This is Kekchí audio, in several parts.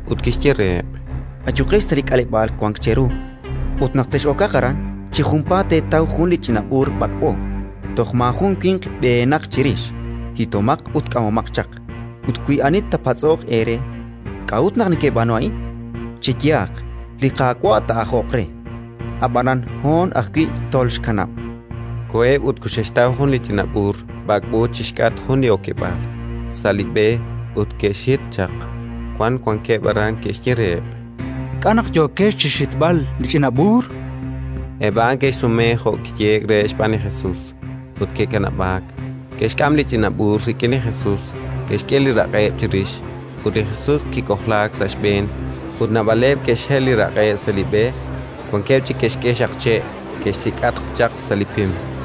ut kixye reheb': —Ayuqex sa' li k'aleb'aal wank cheru ut, naq toxex'okaq aran, chi junpaat teetaw jun li ch'ina b'uur b'ak'b'o, toj maajun winq b'ehenaq chirix. Hitomaq ut k'amomaq chaq. Ut wi ani taapatz'oq eere: «K'a'ut naq nekeb'aanu a'in?», cheyehaq: «Li Qaawa' taa'ajoq re, ab'anan hoon ajwi' tolxkanab'». Koheb' ut koxe'xtaw jun ch'ina b'uur b'ak'b'o chi xk'atq jun li okeb'aal, sa' b'e; ut ke'xhit chaq. Wan wankeb' aran ke'xye reheb': —K'a' naq yookex chi xhitb'al li ch'ina b'uur? Eb' a'an ke'xsume jo' kiyehe'k reheb' xb'aan li Jesus, ut ke'kanab'aak. Ke'xk'am li ch'ina b'uur rik'in li Jesus, ke'xk'e li raq'eb' chirix, ut li Jesus kik'ojlaak sa' xb'een. Ut naab'aleb' ke'xhel li raq'eb' sa' li b'e; wankeb' chik ke'xk'e xaqche' ke'xsik'atq chaq sa' li pim.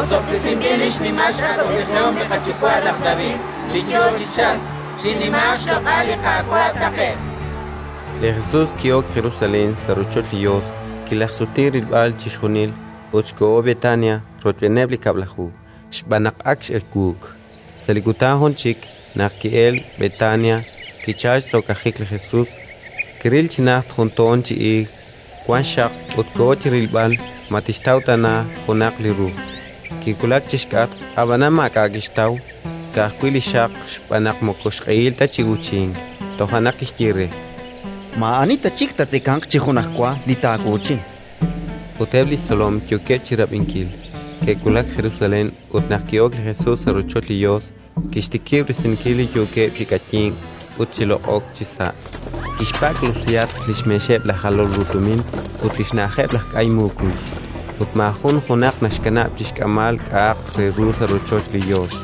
Osob'tesinb'il li xnimal x'awab'ejihom li qayuwa' laj David, li yo chi chalk! Chinimaaq xloq'al li Qaawa' taqe'q! Li Jesus ki'ok Jerusalén, sa' rochoch li Yos, kilajxsuti rilb'al chixjunil ut koho Betania rochb'eeneb' li Kab'laju, xb'aan naq ak x'ewuuk. Sa' li kutan jun chik, naq ke'elk Betania, kichalk xtz'okajik li Jesus. Kiril chi najt jun toon chi iig wank xxaq, ut koho chi rilb'al ma tixtaw tana junaq li ru. Kiwulak chi xk'atq, ab'anan maak'a' kixtaw, ka'ajwi' li xxaq, xb'aan naq moko xq'ehil ta chi uuchink. Toja' naq kixye re: —Maa'ani ta chik taatzekanq chi junajwa li taawuuchin! Ut eb' li xtzolom yookeb' chi rab'inkil. Ke'wulak Jerusalén ut, naq ki'ok li Jesus sa' rochoch li Yos, kixtikib' risinkil li yookeb' chi k'ayink ut chi loq'ok chisa'. Kixpak'lusihatq li xmeexeb' laj jalol ru tumin ut li xna'ajeb' laj k'ay mukuy; ut maajun junaq naxkanab' chi xk'amb'al k'a'aq re ru sa' rochoch li Yos.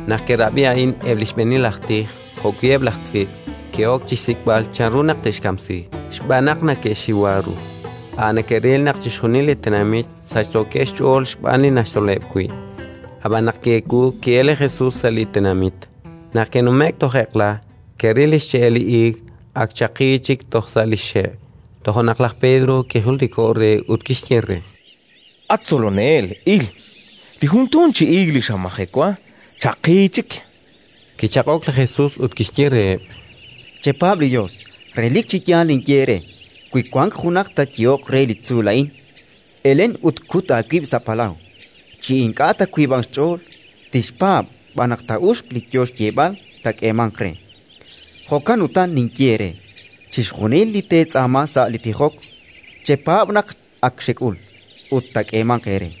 Naq ke'rab'i a'in eb' li xb'eenil aj tij jo'wi' eb' laj tz'iib', ke'ok chi xsik'b'al chanru naq te'xkamsi, xb'aan naq neke'xxiwa ru: a' neke'ril naq chixjunil li tenamit sachsookeb' xch'ool xb'aan li naxtzoleb' wi'. Ab'an naq ki'ewuuk, ki'elk li Jesus sa' li tenamit. Naq ke'nume'k toj eq'la, ke'ril li xche'el li iig ak chaqi chik toj sa' li xxe'. Toja' naq laj Pedro kijultiko'k re ut kixye re: —At Tzolonel, il! Li jun toon chi iig li xamajewa, chaqi chik. Kichaq'ok li Jesus ut kixye reheb': —Chepaab' li Yos. Relik chi yaal ninye eere: wi wank junaq taayehoq re li tzuul a'in: «Elen ut kut aawib' sa' palaw», chi ink'a' taawiib'anq xch'ool, tixpaab' b'an naq taa'uxq li yo xyeeb'al, taak'eemanq re. Jo'kan utan ninye eere: chixjunil li teetz'aama sa' li tijok, chepaab' naq ak xek'ul, ut taak'eemanq eere.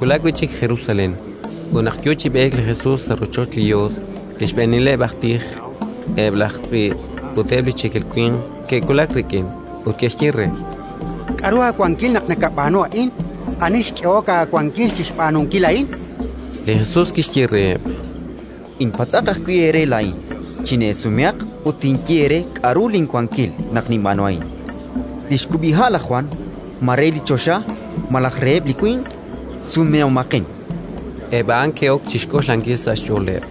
Ke'wulak wi' chik Jerusalén. Ut naq yo chi b'eek li Jesus sa' rochoch li Yos, li xb'eenileb' aj tij, eb' laj tz'iib' ut eb' li cheekel winq ke'wulak rik'in ut ke'xye re: —K'aru aawankil naq nakab'aanu a'in? Ani xk'ehok aawankil chi xb'aanunkil a'in? Li Jesus kixye reheb': —Inpatz'aq ajwi' eere laa'in. Chineesumehaq ut tinye eere k'aru linwankil naq ninb'aanu a'in. Li xkub'iha' laj Jwan, ma re li choxa malaj reheb' li winq? Sumehomaqin. Eb' a'an ke'ok chi xk'oxlankil sa' xch'ooleb':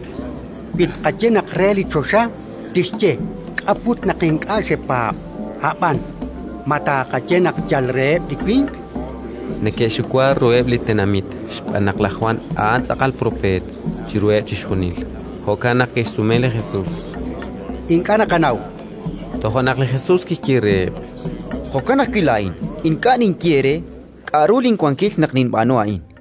“Wi tqaye naq re li choxa, tixye: «K'a' put naq ink'a' xepaab'?». Ab'an, ma tqaye naq yal reheb' li winq?”. Neke'xxiwa ruheb' li tenamit, xb'aan naq laj Jwan a'an tz'aqal propeet chiruheb' chixjunil. Jo'kan naq ke'xsume li Jesus: “Ink'a' naqanaw”, chankeb' re. Toja' naq li Jesus kixye reheb': —Jo'kan ajwi' laa'in ink'a' ninye eere k'aru linwankil naq ninb'aanu a'in.